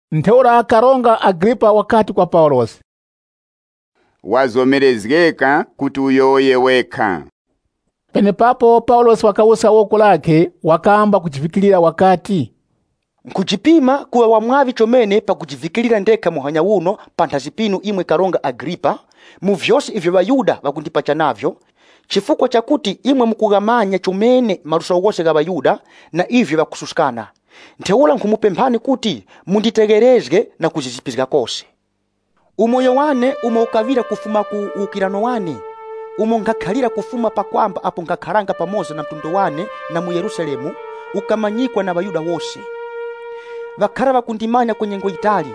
Ntheura Karonga Agripa wakati kwa Paulosi, “Wazomerezgeka kuti uyowoye wekha.” Penepapo Paulosi wakawuska woko lakhe wakamba kujivikirira wakati, “Nkhujipima kuŵa wa mwaŵi chomene pakujivikirira ndekha muhanya uno panthazi pinu, imwe Karonga Agripa, mu vyose ivyo ŵaYuda ŵakundipacha navyo, chifukwa chakuti imwe mukughamanya chomene maluso ghose gha ŵaYuda, na ivyo ŵakususkana. Ntheura nkhumupemphani kuti, munditegherezge, na kuzizipizga kose. “Umoyo wane umo ukaŵira kufuma ku uwukirano wane, umo nkhakhalira kufuma pa kwamba apo nkhakharanga pamoza na mtundu wane na mu Yerusalemu, ukamanyikwa na ŵaYuda wose. Ŵakhara ŵakundimanya kwa nyengo yitali,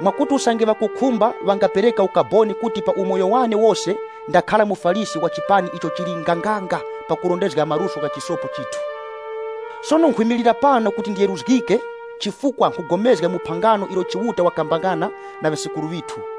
mwakuti, usange ŵakukhumba ŵangapereka ukaboni kuti pa umoyo wane wose ndakhara muFarisi wa chipani icho chili nganganga pakurondezga maluso gha chisopo chithu. Sono nkhwimilira pano kuti ndiyeruzgike chifukwa nkhugomezga mu phangano ilo Chiuta wakapangana na ŵasekuru ŵithu.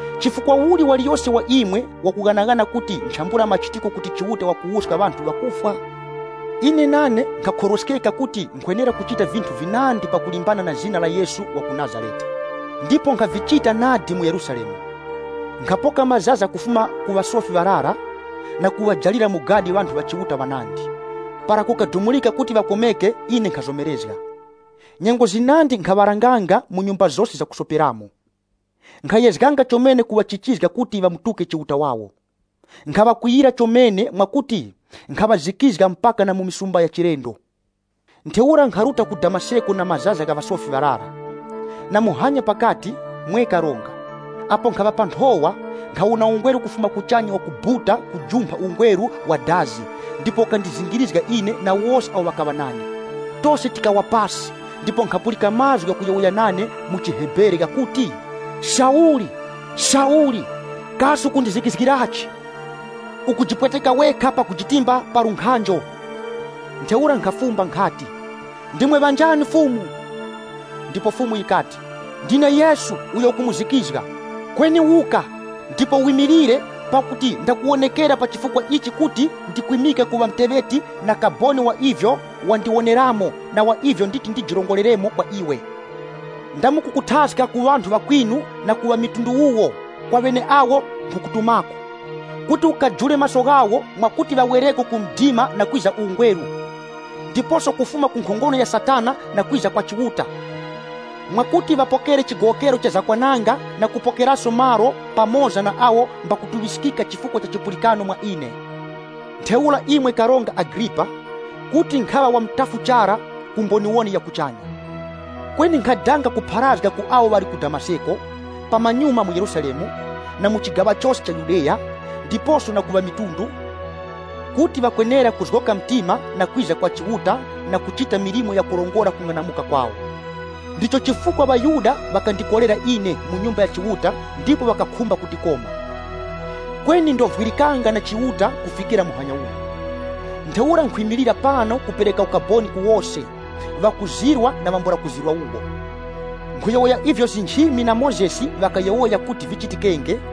Chifukwa uli waliyose wa imwe wakughanaghana kuti nchambula machitiko kuti Chiuta wakuwuska ŵanthu ŵakufwa?” “Ine nane nkhakhorweskeka kuti nkhwenera kuchita vinthu vinandi pakulimbana na zina la Yesu wa ku Nazarete. Ndipo nkhavichita nadi mu Yerusalemu. Nkhapoka mazaza kufuma ku ŵasofi ŵarara na kuŵajalira mu gadi ŵanthu ŵa Chiuta ŵanandi. Para kukadumurika kuti ŵakomeke, ine nkhazomerezga. Nyengo zinandi nkhaŵaranganga mu nyumba zose zakusoperamo. Nkhayezganga chomene kuŵachichizga kuti ŵatuke. Nkhaŵakwiyira chomene mwakuti nkhaŵazikizga mpaka na mu misumba ya chilendo. “Ntheura nkharuta ku Damaseko na mazaza gha ŵasofi ŵarara. Na muhanya pakati, mwe karonga, apo nkhaŵa pa nthowa, nkhawona ungweru kufuma kuchanya wakubuta kujumpha ungweru wa dazi ndipo ukandizingirizga ine na wose awo ŵakaŵa nane. Tose tikawa pasi ndipo nkhapulika mazgu ghakuyowoya nane mu chiHebere ghakuti, ‘Sauli Sauli! Kasi ukundizikizgirachi? Ukujipweteka wekha pakujitimba pa lunkhanjo.’ Ntheura nkhafumba nkhati, ‘Ndimwe ŵanjani, Fumu?’ Ndipo Fumu yikati, ‘Ndine Yesu, uyo ukumuzikizga. Kweni wuka, ndipo wimilire, pakuti ndakuwonekera pa chifukwa ichi kuti ndikwimike kuŵa muteŵeti na kaboni wa ivyo wandiwoneramo na wa ivyo nditi ndijirongoreremo kwa iwe. Ndamukukuthaska ku ŵanthu ŵakwinu na ku ŵamitundu wuwo kwa ŵeneawo nkhukutumako, kuti ukajure maso ghawo mwakuti ŵawereko ku mdima na kwiza ku ungweru, ndiposo kufuma ku nkhongono ya Satana na kwiza kwa Chiuta, mwakuti ŵapokere chigowokero cha zakwananga na kupokeraso malo pamoza na awo mbakutuŵiskika chifukwa cha chipulikano mwa ine.’ “Ntheura, imwe Karonga Agripa, kuti nkhaŵa wa mutafu chara ku mboniwoni ya kuchanya. Kweni nkhadanga kupharazga ku awo ŵali ku Damaseko, pamanyuma mu Yerusalemu, na mu chigaŵa chose cha Yudeya, ndiposo na ku ŵamitundu, kuti ŵakwenera kuzgoka mtima, na kwiza kwa Chiuta, na kuchita milimo yakurongora kung'anamuka kwawo. Ndicho chifukwa ŵaYuda ŵakandikorera ine mu Nyumba ya Chiuta ndipo ŵakakhumba kundikoma. Kweni ndovwirikanga na Chiuta kufikira muhanya uno. Ntheura nkhwimilira pano kupereka ukaboni ku wose, ŵakuzirwa na ŵambula kuzirwa wuwo. Nkhuyowoya ivyo nchimi na Mozesi ŵakayowoya kuti vichitikenge,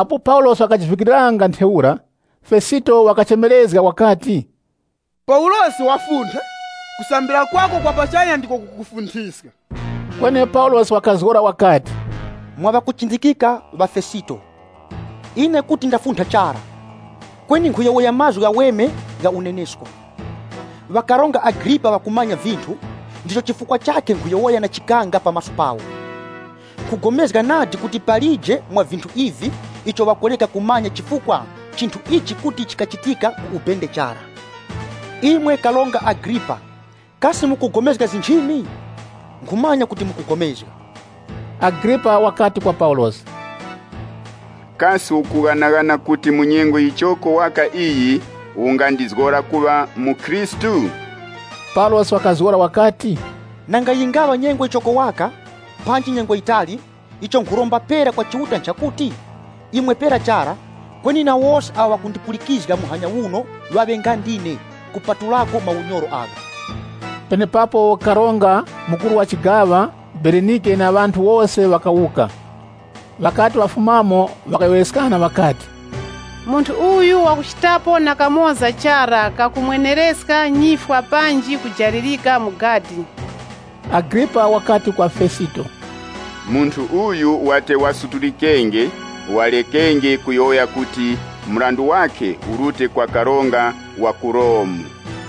Apo Paulosi wakajivikiriranga ntheura, Fesito wakachemerezga wakati, “Paulosi, wafuntha! Kusambira kwako kwa pachanya ndiko kukukufunthiska!” Kweni Paulosi wakazgora wakati, “Mwa ŵakuchindikika ŵa Fesito, ine kuti ndafuntha chara! Kweni nkhuyowoya mazgu ghaweme gha unenesko.” Ŵa Karonga Agripa ŵakumanya vinthu, ndicho chifukwa chakhe nkhuyowoya na chikanga pa maso pawo. Nkhugomezga nadi kuti palije mwa vinthu ivi, icho ŵakureka kumanya chifukwa chinthu ichi kuti chikachitikira ku ubende chara. Imwe Karonga Agripa, kasi mukugomezga nchimi? Nkhumanya kuti mukugomezga! Agripa wakati kwa Paulosi, “Kasi ukughanaghana kuti mu nyengo yichoko waka iyi ungandizgora kuŵa mukhristu?” Paulosi wakazgora wakati, “Nanga yingaŵa nyengo yichoko waka, panji nyengo yitali, icho nkhuromba pera kwa Chiuta nchakuti, imwe pera chara, kweni na wose awo ŵakundipulikizga muhanya uno waŵe nga ndine, kupatulako maunyoro agha.” Penepapo karonga, mukuru wa chigaŵa, Berenike na ŵanthu wose ŵakawuka. Ŵakati ŵafumamo ŵakayowoyeskana ŵakati, “Munthu uyu wakuchitapo na kamoza chara kakumwenereska nyifwa panji kujalirika mu gadi.” Agripa wakati kwa Fesito, “Munthu uyu wate wasutulikenge, warekenge kuyowoya kuti mrandu wakhe urute kwa karonga wa ku Romu.”